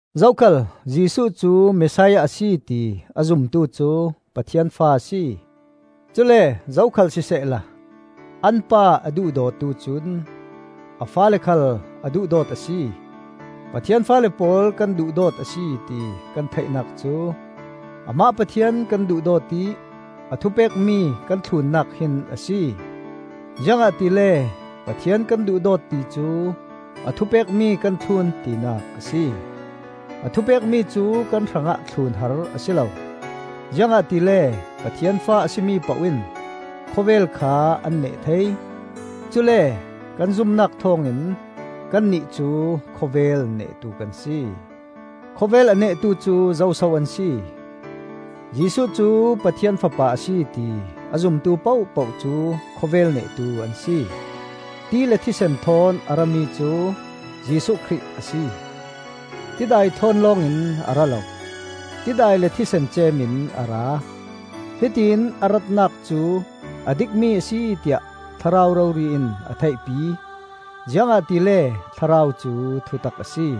Zokhal Jesuh cu Messiah a si ti a zumtu cu Pathian fa a si. Cule zokhal sisehla an pa a duhdawtu cun a faale khal a duhdawt a si. Pathian faale pawl kan duhdawt a si ti kan theihnak cu amah Pathian kan duhdawt ih a thupekmi kan thlunnak hin a si. Ziangahtile Pathian kan duhdawt ti cu a thupekmi kan thlun tinak a si. A thupekmi cu kan hrangah thlun har a si lo, ziangahtile Pathian fa a si mi poh in khawvel kha an neh thei. Cule kan zumnak thawngin kannih cu khawvel nehtu kan si. Khawvel a nehtu cu zo so an si? Jesuh cu Pathian Fapa a si ti a zumtu pohpoh cu khawvel nehtu an si. Ti le thisen thawn a rami cu Jesuh Khrih a si. Tidai thawn lawng in a ra lo, tidai le thisen ceem in a ra. Hitiin a ratnak cu a dikmi a si tiah Thlarau rori in a theihpi, ziangahtile Thlarau cu thutak a si.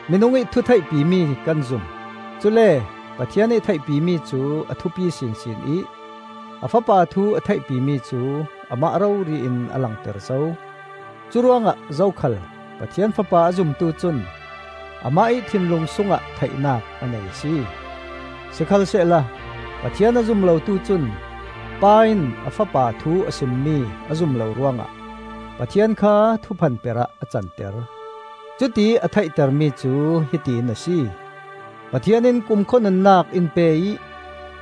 Minungih thu theihpimi kan zum; cule Pathian ih theihpimi cu a thupi sinsin ih a Fapa thu a theihpimi cu amah rori in a langter zo. Curuangah zokhal Pathian Fapa a zumtu cun amah ih thinlung sungah theihnak a nei a si; sikhalsehla Pathian a zum lotu cun, Pa in a Fapa thu a simmi a zum lo ruangah, Pathian kha thuphanper ah a canter. Cutiih a theihtermi cu hiti in a si: Pathian in kumkhua nunnak in pe ih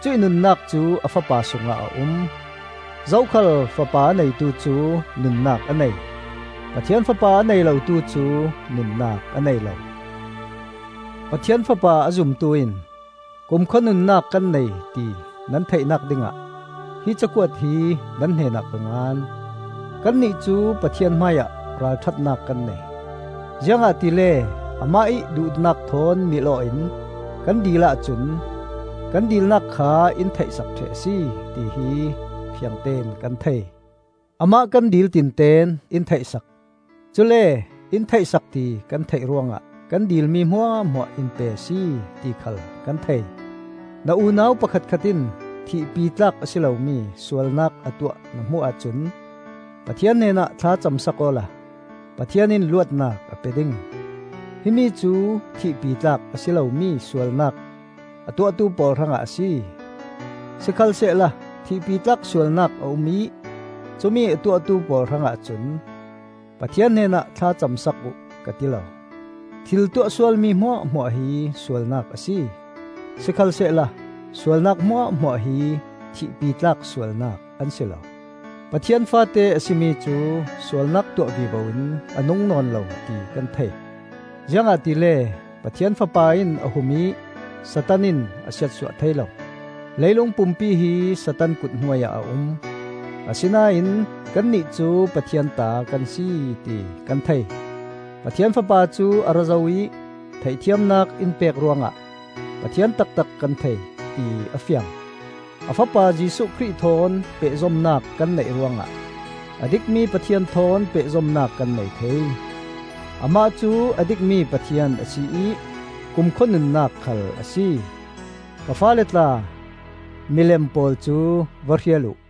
cuih nunnak cu a Fapa sungah a um. Zokhal Fapa a neitu cu nunnak a nei; Pathian Fapa a nei lotu cu nunnak a nei lo. Pathian Fapa a zumtu in kumkhua nunnak kan nei ti nan theihnak dingah hi cakuat hi nan hnenah ka ngan. Kannih cu Pathian hmaiah ralṭhatnak kan nei, ziangahtile amah ih duhnak thawn mil-aw in kan dil ahcun kan dilnak kha in theih sak ṭheh a si, tihi fiangtein kan thei. Amah kan dil tinten in theih sak; cule in theih sak ti kan theih ruangah kan dilmi hmuahhmuah in pe a si, ti khal kan thei. Na unau pakhatkhat in thihpitlak a si lomi sualnak a tuah na hmuh ahcun Pathian hnenah thla cam sak awla Pathian in luatnak a pe ding. Himi cu thihpitlak a si lomi sualnak a tuahtu pawl hrangah a si. Sikhalsehla thihpitlak sualnak a um ih cumi a tuahtu pawl hrangah cun Pathian hnenah thla cam sak uh ka ti lo. Thil tuah sualmi hmuahhmuah hi sualnak a si, sikhalsehla sualnak hmuahhmuah hi thihpitlak sualnak an si lo. Pathian faate a si mi cu sualnak tuah vivo in a nung nawn lo ti kan thei, ziangahtile Pathian Fapa in a hum ih Satan in a siatsuah thei lo. Leilung pumpi hi Satan kut hnuai ah a um; asinain kannih cu Pathian ta kan si ti kan thei. Pathian Fapa cu a ra zo ih theihthiamnak in pek ruangah Pathian taktak kan thei, ti a fiang. A Fapa Jesuh Khrih thawn pehzomnak kan neih ruangah a dikmi Pathian thawn pehzomnak kan nei thei. Amah cu a dikmi Pathian a si ih kumkhua nunnak khal a si. Ka faale tla, milem pawl cu va hrial uh.